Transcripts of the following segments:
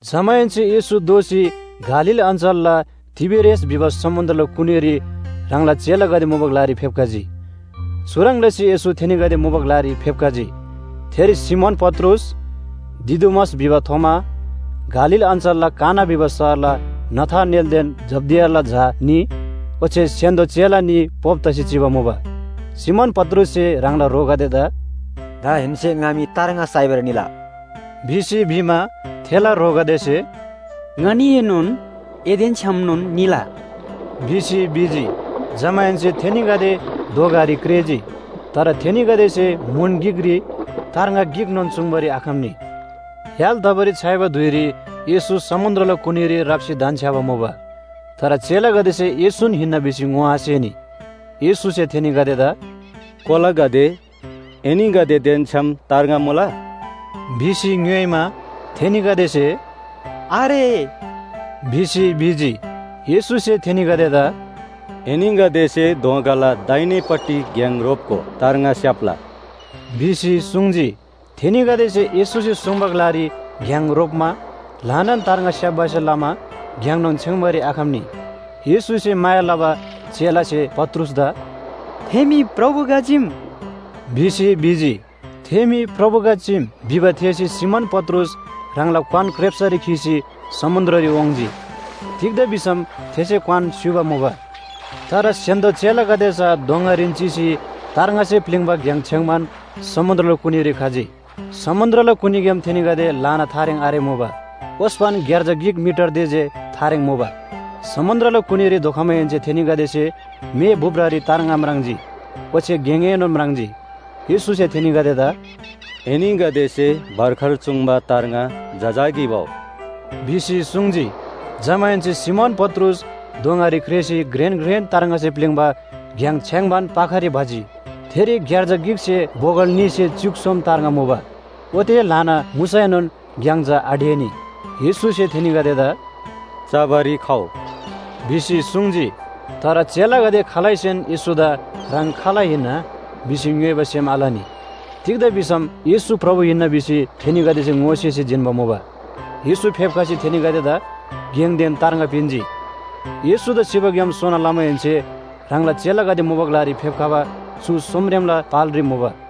जमाहेन्‍से येशू दोःसी गालील अञ्‍चलला तिबेरियास भिबा समुन्‍द्रला कुनीरी ह्राङला चेलागदे मुबा ग्‍लारी फेप्‍खजी। चुह्रङ् लसी येशू थेनीगदे मुबा ग्‍लारी फेप्‍खजी। थेरी सिमोन पत्रुस, दिदुमस भिबा थोमा, गालील अञ्‍चलला काना भिबा शहरला नथानेलदेन जब्‍दियाला झा न्‍ही, ओच्‍छे स्‍य्‍हान्‍दो चेला न्‍ही पोप तसी चिबा मुबा। सिमोन पत्रुससे ह्राङला ह्रोगदेदा “दाहेन्‍से ङा मी तार्ङा साइबारी निला” भिसी भिमा, थेला ह्रोगदेसे “ङनीएनोन एदेन छ्‌यामनोन निला” भिसी भिजी। जमाहेन्‍से थेनीगदे दोँगारी क्रेःजी। तर थेनीगदेसे म्‍हुन गिकरी तार्ङा गिकनोन चुङ्बारी आखम्‍नी। य्‍हाल तबारी छ्‌याइबा धुइरी येशू समुन्‍द्रला कुनीरी राप्‍सी धन्‍छ्‌याबा मुबा। तर चेलागदेसे येशून हिन्‍ना भिसी ङोआसेनी। येशूसे थेनीगदेदा “कोलागदे, एनीगदेदेन छ्‌याम तार्ङा मुला?” भिसी ङ्‌योइमा, थेनीगदेसे “आरे” भिसी भिजी। येशूसे थेनीगदेदा “एनीगदेसे दोँगाला दाहिनेपट्टि घ्‍याङ रोप्‍गो तार्ङा स्‍याप्‍ला” भिसी सुङ्जी। थेनीगदेसे येशूसे सुङ्बा ग्‍लारी घ्‍याङ रोप्‍मा ल्‍हानान तार्ङा स्‍याप्‍बासे लमा घ्‍याङनोन छेङ्बारी आखम्‍नी। येशूसे माया लबा चेलासे पत्रुसदा “थे मी प्रभु गा चीम” भिसी भिजी। “थे मी प्रभु गा चीम” भिबा थेःसी सिमोन पत्रुस ह्राङला क्‍वान क्रेप्‍सरी खीसी समुन्‍द्ररी वाङ्‌जी। तिग्‍दा भिसम थेसे क्‍वान स्‍युबा मुबा। तर स्‍य्‍हान्‍दो चेलागदे चा दोँगारीन चिसी तार्ङासे प्‍लिङ्बा घ्‍याङ छेङ्बान समुन्‍द्रला कुनीरी खजी। समुन्‍द्रला कुनीग्‍याम थेनीगदे ल्‍हाना थारेङ आरेमुबा, ओस्‍पन ग्‍यार्जा गिक मिटर ते जे थारेङ मुबा। समुन्‍द्रला कुनीरी धोखमाहेन्‍से थेनीगदेसे मेभुप्‍रारी तार्ङा म्राङ्जी ओच्‍छे गेङएनोन म्राङ्जी। येशूसे थेनीगदेदा “एनीगदेसे भर्खर चुङ्बा तार्ङा जजाकी भउ” भिसी सुङ्जी। जमाहेन्‍से सिमोन पत्रुस दोँगारी क्रेःसी घ्रेन घ्रेन तार्ङासे प्‍लिङ्बा घ्‍याङ छेङ्बान पाखारी भजी। थेरी ग्‍यार्जा गिकसे बोगल न्‍हीसे च्‍युक सोम तार्ङा मुबा। ओते ल्‍हाना मुसैनोन घ्‍याङ चा आढेनी। येशूसे थेनीगदेदा “चबारी खउ” भिसी सुङ्जी। तर चेलागदे खालैसेन येशूदा “ह्राङ खाल हिन्‍ना?” भिसी ङ्‌योइबा सेम आलनी। तिग्‍दा भिसम येशू प्रभु हिन्‍ना भिसी थेनीगदेसे ङोसेसी जिन्‍बा मुबा। येशू फेप्‍खसी थेनीगदेदा गेङदेन तार्ङा पिन्‍जी। येशूदा सिबाग्‍याम सोना लमाहेन्‍से ह्राङला चेलागदे मुबा ग्‍लारी फेप्‍खबा चु सोमरेमला पालरी मुबा।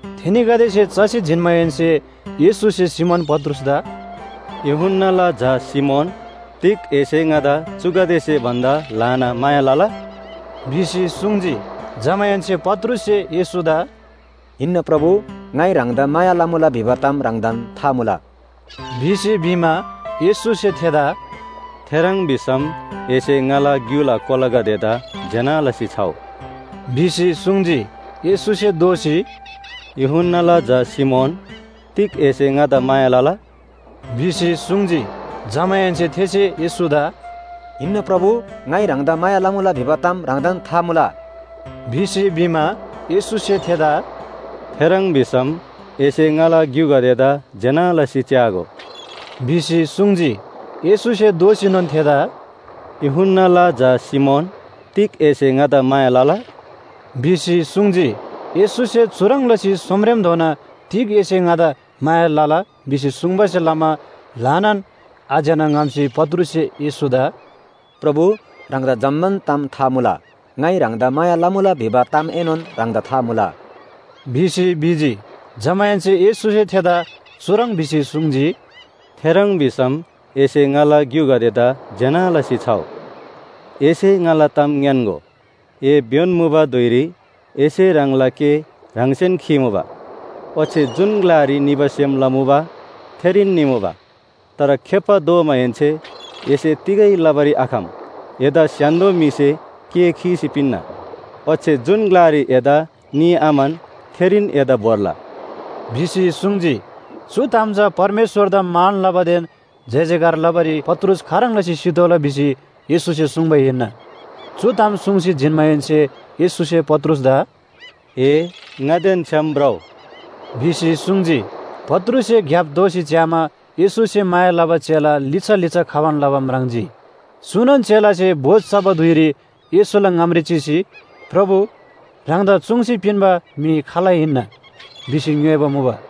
थेनीगदेसे चसी जिन्‍माहेन्‍से येशूसे सिमोन पत्रुसदा “यूहन्‍नाला झा सिमोन, तिग एसे ङादा चुगदेसे भन्‍दा ल्‍हाना माया लला?” भिसी सुङ्जी। जमाहेन्‍से पत्रुससे येशूदा “हिन्‍ना प्रभु, ङाइ ह्राङदा माया लमुला भिबा ताम ह्राङदान था मुला” भिसी भिमा, येशूसे थेदा “थेह्रङ् भिसम एसे ङाला ग्‍युला कोलागदेदा ज्‍यना लसी छउ” भिसी सुङ्जी। येशूसे दोःसी, “यूहन्‍नाला झा सिमोन, तिग एसे ङादा माया लला?” भिसी सुङ्जी। जमाहेन्‍से थेसे येशूदा “हिन्‍ना प्रभु, ङाइ ह्राङदा माया लमुला भिबा ताम ह्राङदान था मुला” भिसी भिमा, येशूसे थेदा “थेह्रङ् भिसम एसे ङाला ग्‍युगदेदा ज्‍यना लसी च्‍यागो” भिसी सुङ्जी। येशूसे दोःसीनोन थेदा “यूहन्‍नाला झा सिमोन, तिग एसे ङादा माया लला?” भिसी सुङ्जी। येशूसे चुह्रङ् लसी सोमरेमधोना “तिग एसे ङादा माया लला?” भिसी सुङ्बासे लमा ल्‍हानान आज्‍यना ङ्‍हम्‍सी पत्रुससे येशूदा “प्रभु, ह्राङदा जम्‍मान ताम था मुला। ङाइ ह्राङदा माया लमुला भिबा तामएनोन ह्राङदा था मुला” भिसी भिजी। जमाहेन्‍से येशूसे थेदा चुह्रङ् भिसी सुङ्जी, “थेह्रङ् भिसम एसे ङाला ग्‍युगदेदा ज्‍यना लसी छउ। एसे ङाला ताम ङ्‌यान्‍गो, ए भ्‍योन मुबा धुइरी एसे ह्राङला केः ह्राङसेन खीमुबा, ओच्‍छे जुन ग्‍लारी निबा सेम लमुबा थेरीन निमुबा। तर खेप्‍बा दोमाहेन्‍से एसे तिगै लबारी आखम, एदा स्‍य्‍हान्‍दो म्‍हिसे केः खीसी पिन्‍ना ओच्‍छे जुन ग्‍लारी एदा निआम्‍हन थेरीन एदा भोर्ला” भिसी सुङ्जी। चु ताम चा परमेश्‍वरदा मान लबादेन जयजयकार लबारी पत्रुस खाह्रङ् लसी सितोःला भिसी येशूसे सुङ्बा हिन्‍ना। चु ताम सुङ्सी जिन्‍माहेन्‍से येशूसे पत्रुसदा “ए ङादेन छ्‌याम भ्रउ” भिसी सुङ्जी। पत्रुससे ग्‍याप दोःसी च्‍यामा येशूसे माया लबा चेला लिच्‍छा लिच्‍छा खबान लबा म्राङ्जी। चुनोन चेलासे भोज चबा धुइरी येशूला ङामरी चिसी, “प्रभु, ह्राङदा चुङ्सी पिन्‍बा म्‍हि खाल हिन्‍ना?” भिसी ङ्‌योइबा मुबा।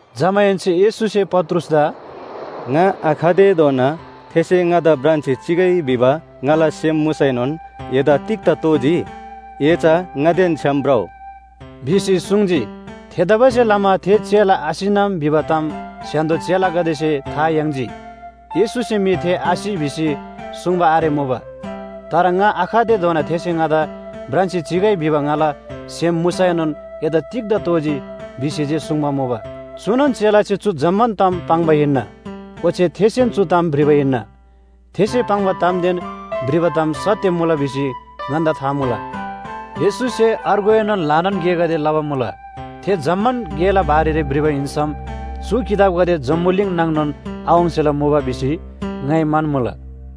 जमाहेन्‍से येशूसे पत्रुसदा “ङा आखतेधोना थेसे ङादा भ्रान्‍सी चिइ भिबा ङाला सेम मुसैनोन एदा तिग्‍दा तोःजी? ए चा ङादेन छ्‌याम भ्रउ” भिसी सुङ्जी। थेतबासेलमा थे चेला आसिनम भिबा ताम स्‍य्‍हान्‍दो चेलागदेसे था याङ्जी। येशूसे मी थे आसि भिसी सुङ्बा आरेमुबा, तर “ङा आखतेधोना थेसे ङादा भ्रान्‍सी चिइ भिबा ङाला सेम मुसैनोन एदा तिग्‍दा तोःजी?” भिसी जे सुङ्बा मुबा। चुनोन चेलासे चु जम्‍मान ताम पाङ्बा हिन्‍ना, ओच्‍छे थेसेन चु ताम भ्रिबा हिन्‍ना। थेसे पाङ्बा तामदेन भ्रिबा ताम सत्‍य मुला भिसी ङन्‍दा था मुला। येशूसे अर्गुएनोन ल्‍हानान गेगदे लबा मुला। थे जम्‍मान गेला बारेरी भ्रिबा हिन्‍सम चु किताबगदे जम्‍बुलिङ नाङनोन आवाङ्सेला मुबा भिसी ङाइ म्‍हन्‍मुला।